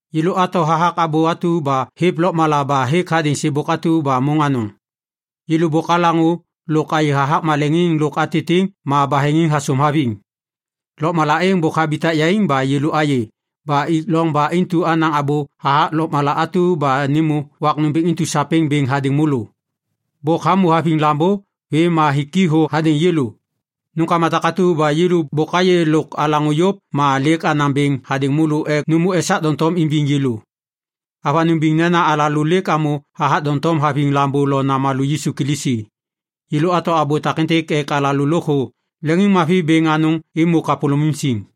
Yêlô ato hathak Abô atu ba hêv lôkmala ba hêk hadêŋ sêbôk atu ba môŋ anôŋ. Yêlô bôk alaŋô lôk ayê hathak maleŋiŋ lôk atitiŋ ba baheŋiŋ hasôm haviŋ. Lôkmala êŋ bôk habitak yaiŋ ba yêlô ayê ba ik loŋ ba intu anaŋ abô hathak lôkmala atu ba nêmô wak nômbêŋ intu sapêŋ bêŋ hadêŋ môlô. Bôk hamô haviŋ Lambô vêm ma hik i thô hadêŋ yêlô. Nômkama takatu ba yêlô bôk ayê lôk alaŋô yôv ma lêk anaŋ bêŋ hadêŋ môlô ek nômô esak doŋtom imbiŋ yêlô. Avanôŋ biŋ nena alalô lêk amô hathak doŋtom haviŋ Lambô lo Namalô Yisu Kilisi. Yêlô ato abô takêntêk ek alalô lôkthô leŋiŋmavi bêŋ anôŋ êmô kapôlôŋiŋ siŋ.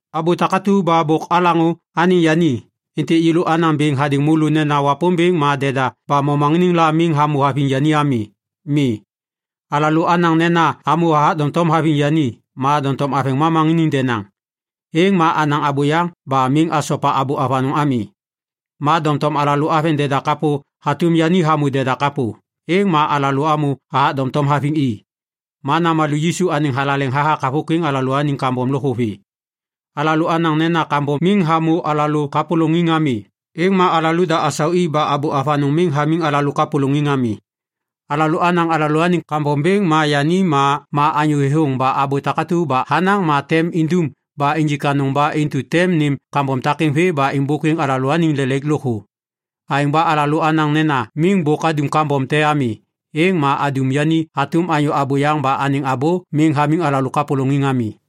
Abô takatu ba bôk alaŋô anêŋ yani, êntêk yêlô anaŋ bêŋ hadêŋ môlô nena Wapômbêŋ ma deda ba momaŋiniŋ la miŋ hamô haviŋ yani ami. Mi. Alalô anaŋ nena amô hathak doŋtom haviŋ yani ma doŋtom aveŋ momaŋiniŋ denaŋ, êŋ ma anaŋ abôyaŋ ba miŋ asopa abô avanôŋ ami. Ma doŋtom alalô aveŋ deda kapô hatôm yani hamô deda kapô, êŋ ma alalô amô hathak doŋtom haviŋ i. Ma Namalô Yisu anêŋ thalaleŋ hathak havôkwiŋ alalôaniŋ kambom lôkthô vê. Alalô anaŋ nena kambom miŋ hamô alalô kapôlôŋiŋ ami, êŋ ma asau alalôda ba abô avanôŋ miŋ hamiŋ alalô kapôlôŋiŋ ami. Alalô anaŋ alalôaniŋ kambom bêŋ ma yani ma anyô thêthôŋ ba abô takatu ba hanaŋ ma tem indum ba injik anôŋ ba intu tem nêm kambom takêŋ vê ma êmbôkwiŋ alalôaniŋ lelaik lôkthô. Aêŋ ba alalô anaŋ nena miŋ bôk adum kambom te ami, êŋ ma adum yani hatôm anyô abôyaŋ ba anêŋ abô miŋ hamiŋ alalô kapôlôŋiŋ ami.